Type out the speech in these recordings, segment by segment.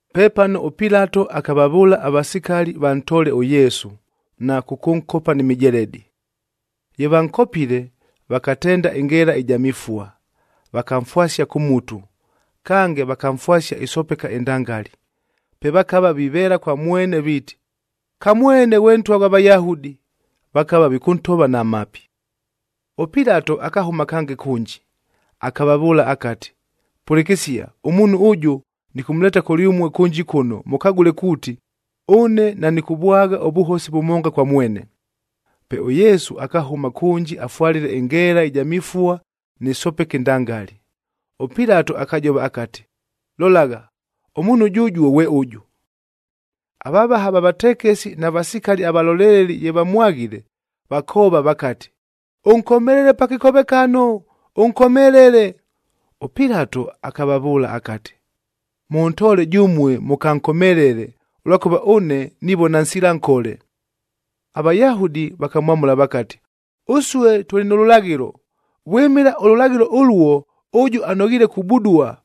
Pepano ʉPilato akavavʉʉla avasikali vantoole ʉYesu, na kʉkʉnkopa ni mijeledi. Ye vankopile, vakatenda ɨngeela ɨja mifua, vakamfwasia kʉ mutu, kange vakamfwasia ɨsopeka ɨndangali. Pe vakava viveela kwa mwene viiti, “Kamwene ghwe Ntwa ghwa Vayahudi.” Vakava vikʉntova na mapi. ɄPilato akahʉma kange kʉnji, akavavʉʉla akati, “Pʉlɨkɨsia, ʉmuunhu ʉjʉ nɨkʉmʉleeta kʉlyʉmue kʉnji kʉno mʉkagʉle kuuti, ʉne nanɨkʉvwagha ʉvʉhosi vʉmonga kwa mwene.” Pe ʉYesu akahʉma kʉnji afwalile ɨngeela ɨja mifua nɨ sopeka ɨndangali. ɄPilato akajova akati, “Lolagha, ʉmuunhu jʉjuo ghwe ʉjʉ!” Avavaha va vatekesi na vasikali avaloleleli ye vamwaghile, vakoova vakati, “Ʉnkomelele pa kɨkovekano, ʉnkomelele!” ɄPilato akavavʉʉla akati, “Mʉntoole jʉmue mʉkankomelele, ʉlwakʉva ʉne nivona nsila nkole.” AVayahudi vakamwamʉla vakati, “Ʉsue tʉlɨ nʉ lʉlaghɨlo, vwɨmɨla ʉlʉlaghɨlo ʉluo ʉjʉ anoghiile kubudua,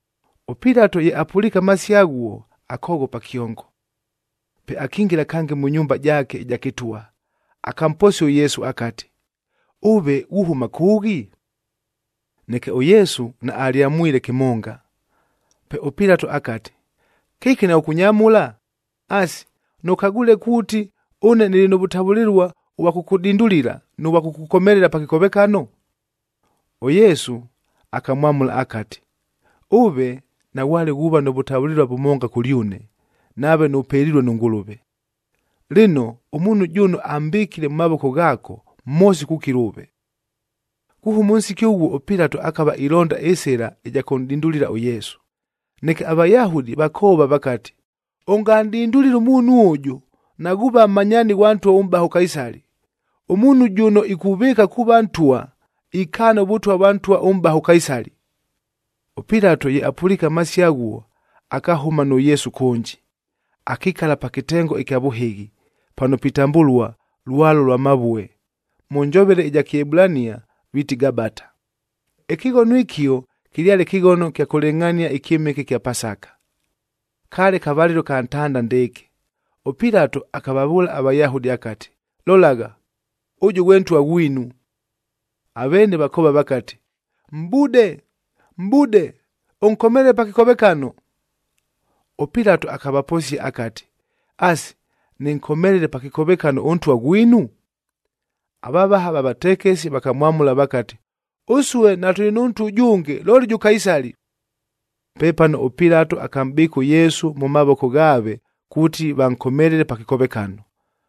ɄPilato ye apʉliike amasio aghuo, akoghopa kyongo. Pe akingila kange mʉ nyumba jaake ɨja kɨtwa, akamposia ʉYesu akati, “Ʉve ghuhʉma kʉʉghi?” Neke ʉYesu naalyamwamwile kɨmonga. Pe ʉPilato akati, “Kɨki naghʉkʉnyamʉla? Asi, nʉkagwile kuuti ʉne nɨlɨ nʉ vʉtavʉlɨlua ʉvwa kʉkʉdindulila, nʉ vwa kʉkʉkomelela pa kɨkovekano?” ɄYesu akamwamʉla akati, “Ʉve naghwale ghuuva nʉ vʉtavʉlɨlua vʉmonga kʉlyʉne, nave nʉpelilue nʉ Ngʉlʉve. Lɨno, ʉmuunhu jʉno ambɨkile mʉ mavoko ghaako, mhosi kukila ʉve.” Kuhʉma ʉnsiki ʉghuo ʉPilato akava ilonda ɨsɨla ɨja kʉnʼdindulila ʉYesu. Neke aVayahudi vakoova vakati, “Ʉnganʼdindulile ʉmuunhu ʉjʉ, naghuuva mmanyaani ghwa ntwa ʉmʼbaha ʉKaisali.b Ʉmuunhu jʉno ikuvɨɨka kuuva ntwa, ikaana ʉvʉtwa vwa ntwa ʉmʼbaha ʉKaisali.” ɄPilato ye apʉliike amasio aghuo, akahʉma nʉ Yesu kʉnji, akikala pa kɨtengo ɨkya vʉhɨghi, pano pitambʉlua Lwalo lwa Mavue, mʉ njovele ɨja Kɨebulania viiti, Gabata. Ɨkɨghono ɨkio kɨlyale kɨghono kya kʉlɨngʼhania ɨkyɨmɨke ɨkya Pasaka, kaale kavalɨlo ka ntanda ndɨɨkɨ. ɄPilato akavavʉʉla aVayahudi akati, “Lolagha, ʉjʉ ghwe Ntwa ghwinu!” Aveene vakoova vakati, “Mʼbude, mʼbude! Ʉnkomelele pa kɨkovekano!” ɄPilato akavaposia akati, “Asi, nɨnkomelele pa kɨkovekano ʉNtwa ghwinu?” Avavaha va vatekesi vakamwamʉla vakati, “Ʉsue natʉlɨ nʉ ntwa ʉjʉnge, looli jʉ Kaisali!” Pepano ʉPilato akamʼbɨɨka ʉYesu mʉ mavoko ghaave kuuti vankomelele pa kɨkovekano.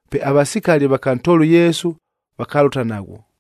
Pe avasikali vakantoola ʉYesu, vakalʉta naghwo.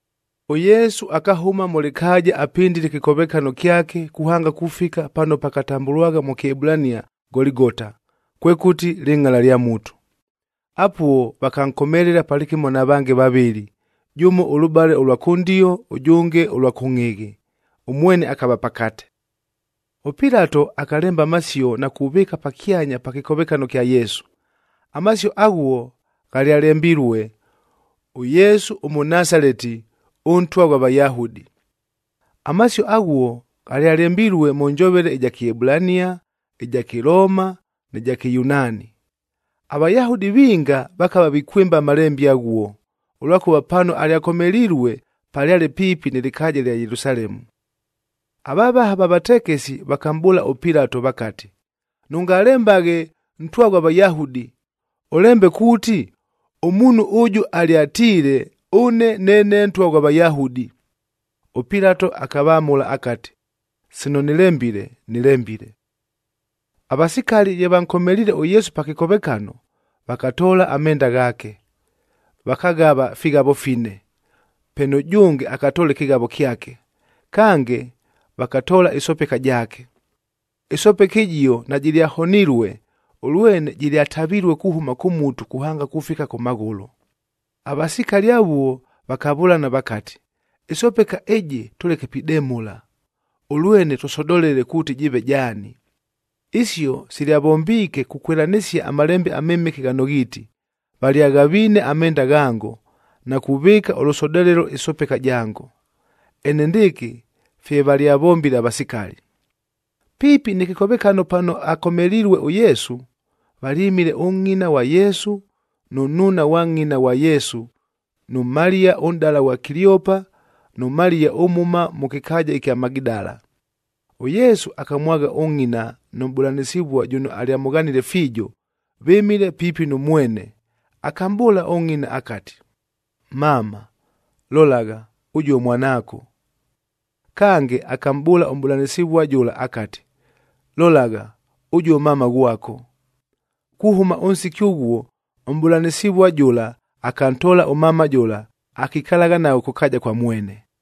ɄYesu akahʉma mʉ lɨkaaja apɨndile ɨkɨkovekano kyake kuhanga kufika pano pakatambʉlwagha mʉ Kɨebulania Goligota, kwekʉti, Lɨngʼala lya Mutu. Apuo vakankomelela palɨkɨmo na vange vavɨlɨ, jʉmo ʉlʉbale ʉlwa kʉndio, ʉjʉnge ʉlwa kʉngʼhɨghɨ, ʉmwene akava pakate. ɄPilato akalemba amasio na kuvɨɨka pakyanya pa kɨkovekano kya Yesu. Amasio aghuo ghalyalembilue, “ɄYESU ɄMɄNASALETI, ɄNTWA GHWA VAYAHUDI.” Amasio aghuo ghalyalembilue mʉ njovele ɨja Kɨebulania, ɨja Kɨlooma nɨ ja Kɨyunaani. AVayahudi vinga vakava vikwɨmba amalembe aghuo, ʉlwakʉva pano alyakomelilue palyale piipi nɨ lɨkaaja lya Yelusalemu. Avavaha va vatekesi vakamʼbʉʉla ʉPilato vakati, “Nʉngalembaghe ‘Ntwa ghwa Vayahudi,’ ʉlembe kuuti, ‘Ʉmuunhu ʉjʉ alyatiile, ɄNE NEENE NTWA GHWA VAYAHUDI.’” ɄPilato akavamʉla akati, “Sino nɨlembile, nɨlembile.” Avasikali ye vankomeliile ʉYesu pa kɨkovekano, vakatoola amenda ghaake, vakaghava fighavo fine, pe nʉjʉnge akatoola ɨkɨghavo kyake. Kange, vakatoola ɨsopeka jaake. Ɨsopeka ɨjio najɨlyahonilue, ʉlwene jɨlyatavilue kuhʉma kʉ mutu kuhanga kufika kʉ maghʉlʉ. Avasikali avuo vakavʉlana vakati, “Ɨsopeka ɨjɨ tʉleke pidemʉla, ʉlwene tʉsodolele kuuti jɨɨve jaani.” Isio silyavombiike kukwɨlanɨsia aMalembe aMɨmɨke ghano ghiiti, “Valyaghaviine amenda ghango, na kuvɨɨka ʉlʉsodolelo ɨsopeka jango.”c Enendɨɨkɨ fye valyavombile avasikali. Piipi nɨ kɨkovekano pano akomelilue ʉYesu, valyɨmile ʉngʼina ghwa Yesu, nʉ nnuuna ghwa ngʼina ghwa Yesu, nʉ Maliya ʉnʼdala ghwa Kiliopa nʉ Maliya ʉmhʉma mʉ kɨkaaja ɨkya Magidala. ɄYesu akamwagha ʉngʼina nʉ mʼbʉlanɨsɨvua jʉno alyamʉghanile fiijo, vɨmile piipi nʉ mwene, akamʼbʉʉla ʉngʼina akati, “Mama, lolagha, ʉjuo mwanaako.” Kange, akamʼbʉʉla ʉmʼbʉlanɨsɨvua jʉla akati, “Lolagha, ʉjuo mama ghwako.” Kuhʉma ʉnsiki ʉghuo ʉmʼbʉlanɨsɨvua jʉla akantoola ʉmama jʉla, akikalagha naghwo kʉ kaaja kwa mwene.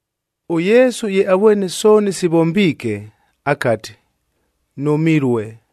ɄYesu ye avwene sooni sivombiike, akati, “Nʉmilue!”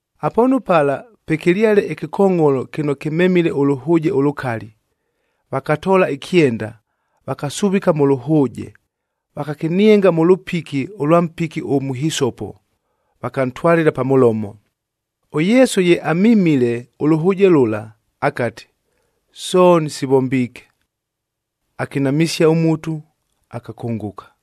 Apoonu pala pwekɨlyale ɨkɨkongʼholo kɨno kɨmemile ʉlʉhʉʉje ʉlʉkali. Vakatoola ɨkyenda, vakasuvika mʉ lʉhʉʉje, vakakɨnienga mʉ lʉpiki ʉlwa mpiki ʉmʉhisopo, vakantwalɨla pa mʉlomo. ɄYesu ye amimile ʉlʉhʉʉje lʉla, akati, “Sooni sivombiike!” Akinamɨsia ʉmutu, akakʉngʉka.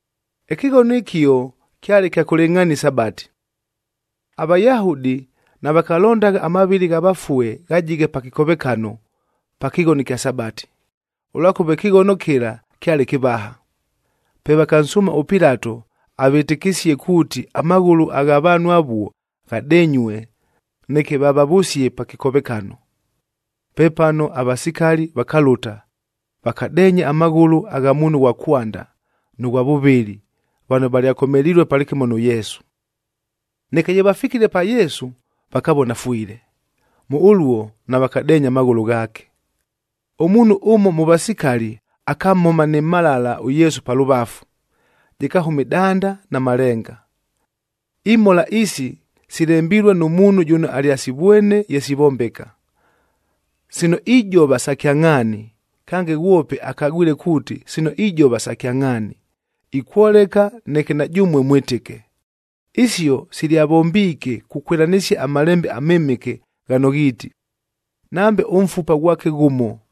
Ɨkɨghono ɨkio kyale kya kʉlɨngʼhania ɨSabati.e AVayahudi navakalondagha amavɨlɨ gha vafue ghajighe pa kɨkovekano pa kɨghono ɨkya Sabati, ʉlwakʉva ɨkɨghono kɨla kyale kɨvaha.f Pe vakansʉʉma ʉPilato avɨtɨkɨsie kuuti amaghʉlʉ agha vaanhu avuo, ghadenyue,g neke vavavʉsie pa kɨkovekano. Pepano avasikali vakalʉta, vakadeenya amaghʉlʉ agha muunhu ʉghwa kwanda nʉ ghwa vʉvɨlɨ vano valyakomelilue palɨkɨmo nʉ Yesu. Neke ye vafikile pa Yesu, vakavona afwile. Mʉ ʉluo navakadeenya amaghʉlʉ ghaake. Ʉmuunhu ʉmo mʉ vasikali akamhoma nɨ mhalala ʉYesu pa lʉvafu, jɨkahʉma ɨdanda na malenga. Imhola isi silembilue nʉ muunhu jʉno alyasivwene ye sivombeka. Sino ijova sa kyangʼhaani, kange ghwope akagwile kuuti sino ijova sa kyangʼhaani, ikwoleka neke na jʉmue mwɨtɨke. Isio silyavombiike kukwɨlanɨsia aMalembe aMɨmɨke ghano ghiiti, “Nambe ʉmfupa ghwake ghʉmo,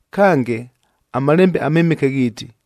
Kange, aMalembe aMɨmɨke ghiiti,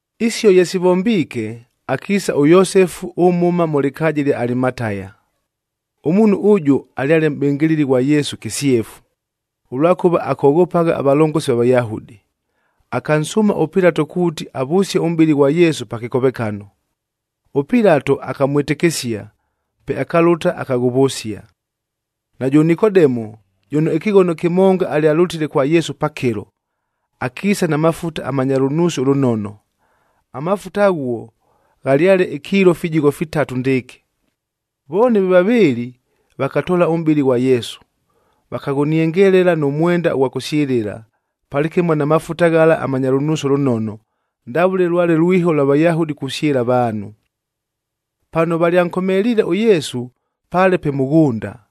Isio ye sivombiike, akiisa ʉYosefu ʉmhʉma mʉ lɨkaaja ɨlya Alimataya. Ʉmuunhu ʉjʉ alyale mʼbɨngɨlɨli ghwa Yesu kɨsyefu, ʉlwakʉva akoghopagha avalongosi va Vayahudi. Akansʉʉma ʉPilato kuuti avʉsie ʉmʼbɨlɨ ghwa Yesu pa kɨkovekano. ɄPilato akamwɨtɨkɨsia, pe akalʉta, akaghʉvʉsia. Najʉ Nikodemu, jʉno ɨkɨghono kɨmonga alyalʉtile kwa Yesu pakɨlo,j akiisa na mafuta amanya lʉnuusi ʉlʉnono. Amafuta aghuo ghalyale ikiilo fijigho fitatu ndɨɨkɨ. Vooni ve vavɨɨlɨ vakatoola ʉmʼbɨlɨ ghwa Yesu, vakaghʉniengelela nʉ mwenda ʉghwa kʉsyɨlɨla, palɨkɨmo na mafuta ghala amanya lʉnuusi ʉlʉnono, ndavʉle lwale lwiho lwa Vayahudi kusyɨla avaanhu. Pano valyankomeliile ʉYesu paale pe mʉghʉnda.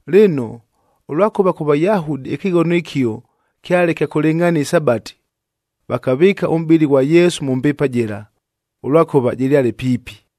Lɨno, ʉlwakʉva kʉ Vayahudi ɨkɨghono ɨkio kyale kya kʉlɨngʼhania ɨSabati, vakavɨɨka ʉmʼbɨlɨ ghwa Yesu mʉ mbiipa jɨla, ʉlwakʉva jɨlyale piipi.